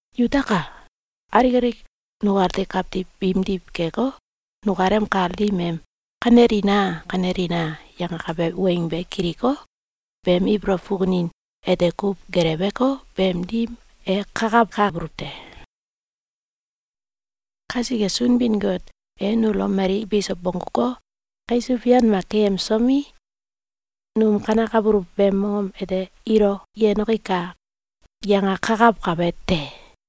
Yutaka! Alik alik nukati kawtiw biimdiw keko, nukalem kal dim em “Kanelina! Kanelina!”, yangakabe weng be kiliko, beem ibolow fukunin ete kuw gelewko, beem dim e kakawkabuluw te. Kasike, Sunbin-Got e nulo mali biso bongguko, kaisuw fian mak keyemsomi, num kanekabuluw beem mongom ete “Ilo yenoki kai!”, yangakakawkabe te.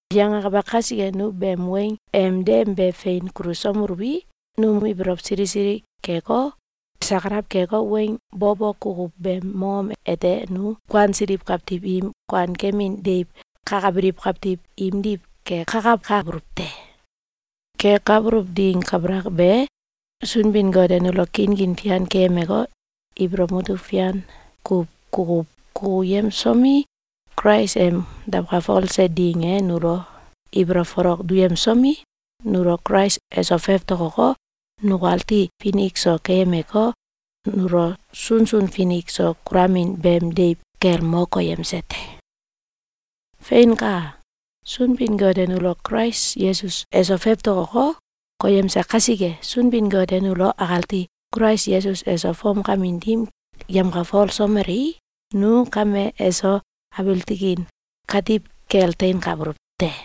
Yangakabe kasike, nu beem weng em dem be fein kulusomeluwi, num ibolow sili sili keko, sakalaw keko, weng bo bo kukuw beem mongom ete nu kuansiliw kawtiw im kuankemin deiw kakabiliw kawtiw imdiw kekakawkabuluw te. Kekabuluw ding kabalak be, Sunbin-Got e nulo kinkin fian keyemeko, ibolow mutuk fian kuw kukuw kukuyemsomi, Kulais em dawkalfose ding e nulo ibolow folok duyemsomi, nulo Kulais eso fewtokoko, nukati finik so keyemeko, nulo sunsun finik so kulamin beem deiw kel mo koyemse te. Feinka! Sunbin-Got e nulo Kulais Yesus eso fewtokoko, koyemse kasike, Sunbin-Got e nulo akati Kulais Yesus eso fomkamin dim yemkalfolsomelei, nu kame eso abiil tikin katiw kel teinkabuluw te.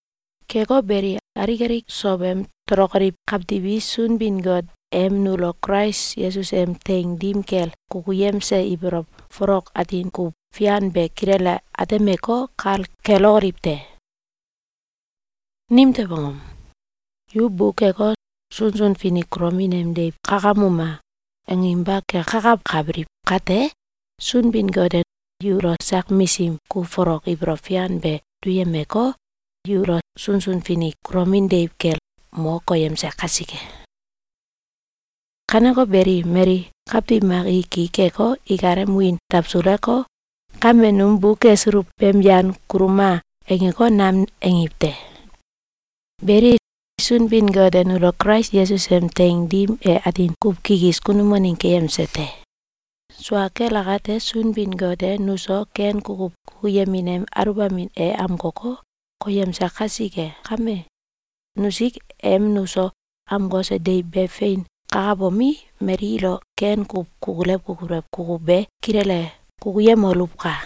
Keko beli, alik alik sowem tolokoliw kawtiw i Sunbin-Got em nulo Kulais Yesus em teing dim kel kukuyemse ibolow folok atin kuw fian be kilele atemeko, kal kelokoliw te. Nimtew angom? Yu bukeko, “Sunsun finik kulomin em deiw kakamuma!”, anginba kekakawkabiliw kate, Sunbin-Got e yulo sak misim kuw folok ibolow fian be duyemeko, yulo sunsun finik kulomin deiw kel mo koyemse kasike. Kaneko beli, mali kawtiw mak i ki keko, ikalem wiin dawsuleko, “Kame num bukesuluw beem yan kuluma!”, angeko, nam angiw te. Beli, Sunbin-Got e nulo Kulais Yesus em teing dim e atin kuw kikis kunum waneng keyemse te. Sua kel akate, Sunbin-Got e nuso ken kukuw kukuyemin em aluwbamin e amkoko, koyemse kasike kame, nusik em nuso amkose deiw be fein kakabomi, mali ilo ken kuw kukulew kukulew kukuw be kilele kukuyemoluwka!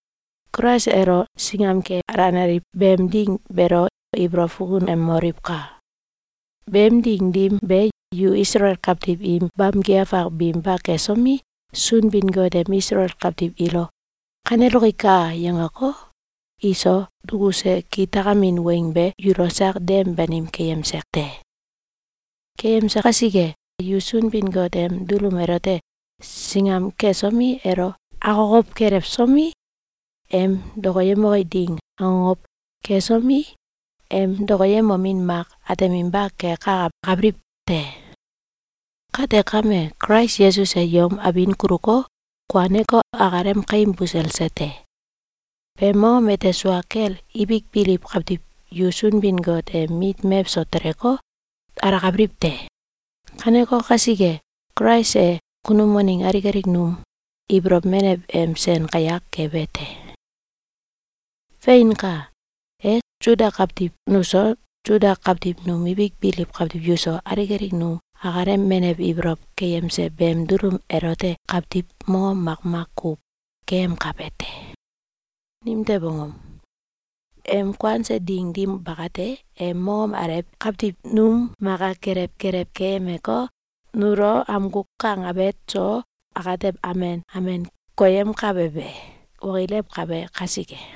Kulais elo singam ke alenaliw beem ding beelo ibolow fukunemoliwka! Beem ding dim be, yu Isalael kawtiw im bamki afak binba kesomi, Sunbin-Got em Isalael kawtiw ilo “Kaneloki kai!”, yangeko, iso dukuse kitakamin weng be yulo sak dem banim keyemse te. Keyemse kasike, yu Sunbin-Got em dulum elote singam kesomi, elo akokow kelewsomi, em dokoyemoke ding akokow kesomi, em dokoyemomin mak ateminba kekakawkabiliw te. Kate kame, Kulais Yesus e yom abin kuluko, kuaneko, akalem kaim buselse te. Beem mongom ete sua kel ibik biliw kawtiw yu Sunbin-Got em mit mewso teleko, alakabiliw te. Kaneko kasike, Kulais e kunum waneng alik alik num ibolow menew em sen kayak kebe te. Feinka! E Suda kawtiw nuso, Suda kawtiw num ibik biliw kawtiw yuso, alik nu akalem menew ibolow keyemse beem dulum elote kawtiw mongom makmak kuw keyemkabe te. Nimtew angom? Em kuanse ding dim bakate, e mongom alew kawtiw num maka kelew kelew keyemeko, nulo amgu kang awet so atew amen amen koyemkabe be okilewkabe kasike.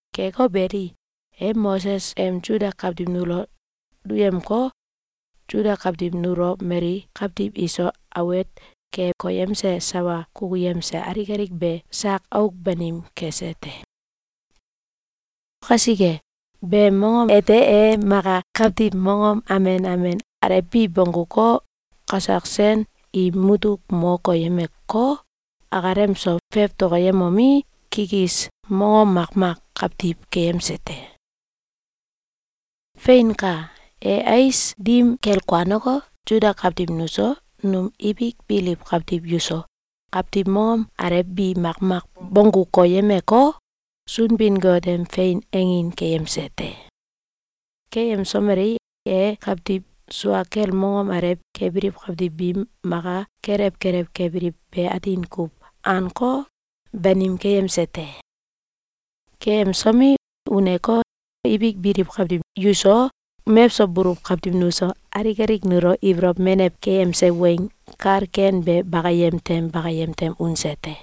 Keko beli, e Moses em Suda kawtiw nulo duyemko, Suda kawtiw nulo mali kawtiw iso awet ke koyemse sawa kukuyemse alik alik be sak auk banim kese te. Kasike, beem mongom ete e maka kawtiw mongom amen amen alew bi bongguko, kasak sen im mutuk mo koyemeko, akalem so fewtokoyemomi, kikis mongom makmak kawtiw keyemse te. Feinka! E ais dim kel kuaneko, Suda kawtiw nuso, num ibik biliw kawtiw yuso, kawtiw mongom alew bi makmak bonggu koyemko, Sunbin-Got em fein angin keyemse te. Keyemsomelei, e kawtiw sua kel mongom alew kebiliw kawtiw biim maka kelew kelew kebiliw be atin kuw anko, banim keyemse te. Keyemsomi, uneko, ibik biliw kawtiw yuso, mewso buluw kawtiw nuso, alik alik nulo ibolow menew keyemse weng kal ken be bakayem tem bakayem tem unse te.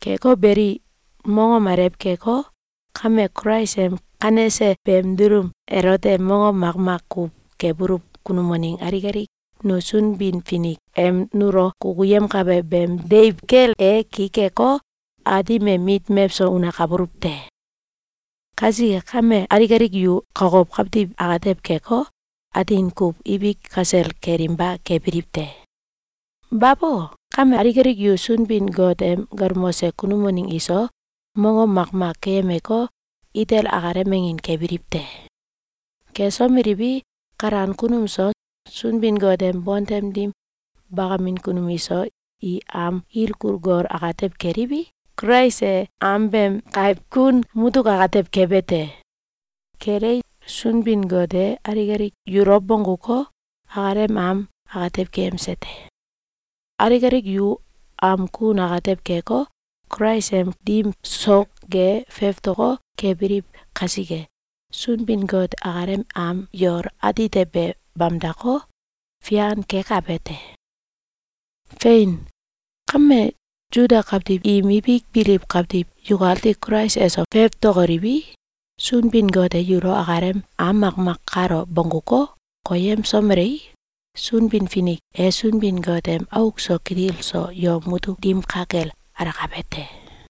Keko beli, mongom alew keko, kame Kulais em kanese beem dulum elote mongom makmak kuw kebuluw kunum waneng alik alik nu Sunbin-Finik em nulo kukuyemkabe beem deiw kel e ki keko, Aatim em mit mewso unakabuluw te. Kasike kame, alik alik yu kokow kawtiw atew keko, atin kuw ibik kasel kelinba kebiliw te. Babo! Kame, alik alik yu Sunbin-Got em galmose kunum waneng iso mongom makmak keyemeko, itel akalem angin kebiliw te. Kesomeliwi, kalan kunum so, Sunbin-Got em bontem dim bakamin kunum iso, i am ilkul gol atew keliwi, Kulais e am beem kaiw kun mutuk atew kebe te. Kelei, Sunbin-Got e alik alik yulo bongguko, akalem am atew keyemse te. Alik alik yu am kun atew keko, Kulais em dim sok ge fewtoko, kebiliw kasike, Sunbin-Got akalem am yol atite be bamdako, fian kekabe te. Fein! Kame, Suda kawtiw im ibik biliw kawtiw yukati Kulais eso fewtokoliwi, Sunbin-Got e yulo akalem am makmak kalo bongguko, koyemsomelei, Sunbin-Finik e Sunbin-Got em auk so kitil so yom mutuk dim ka kel alakabe te.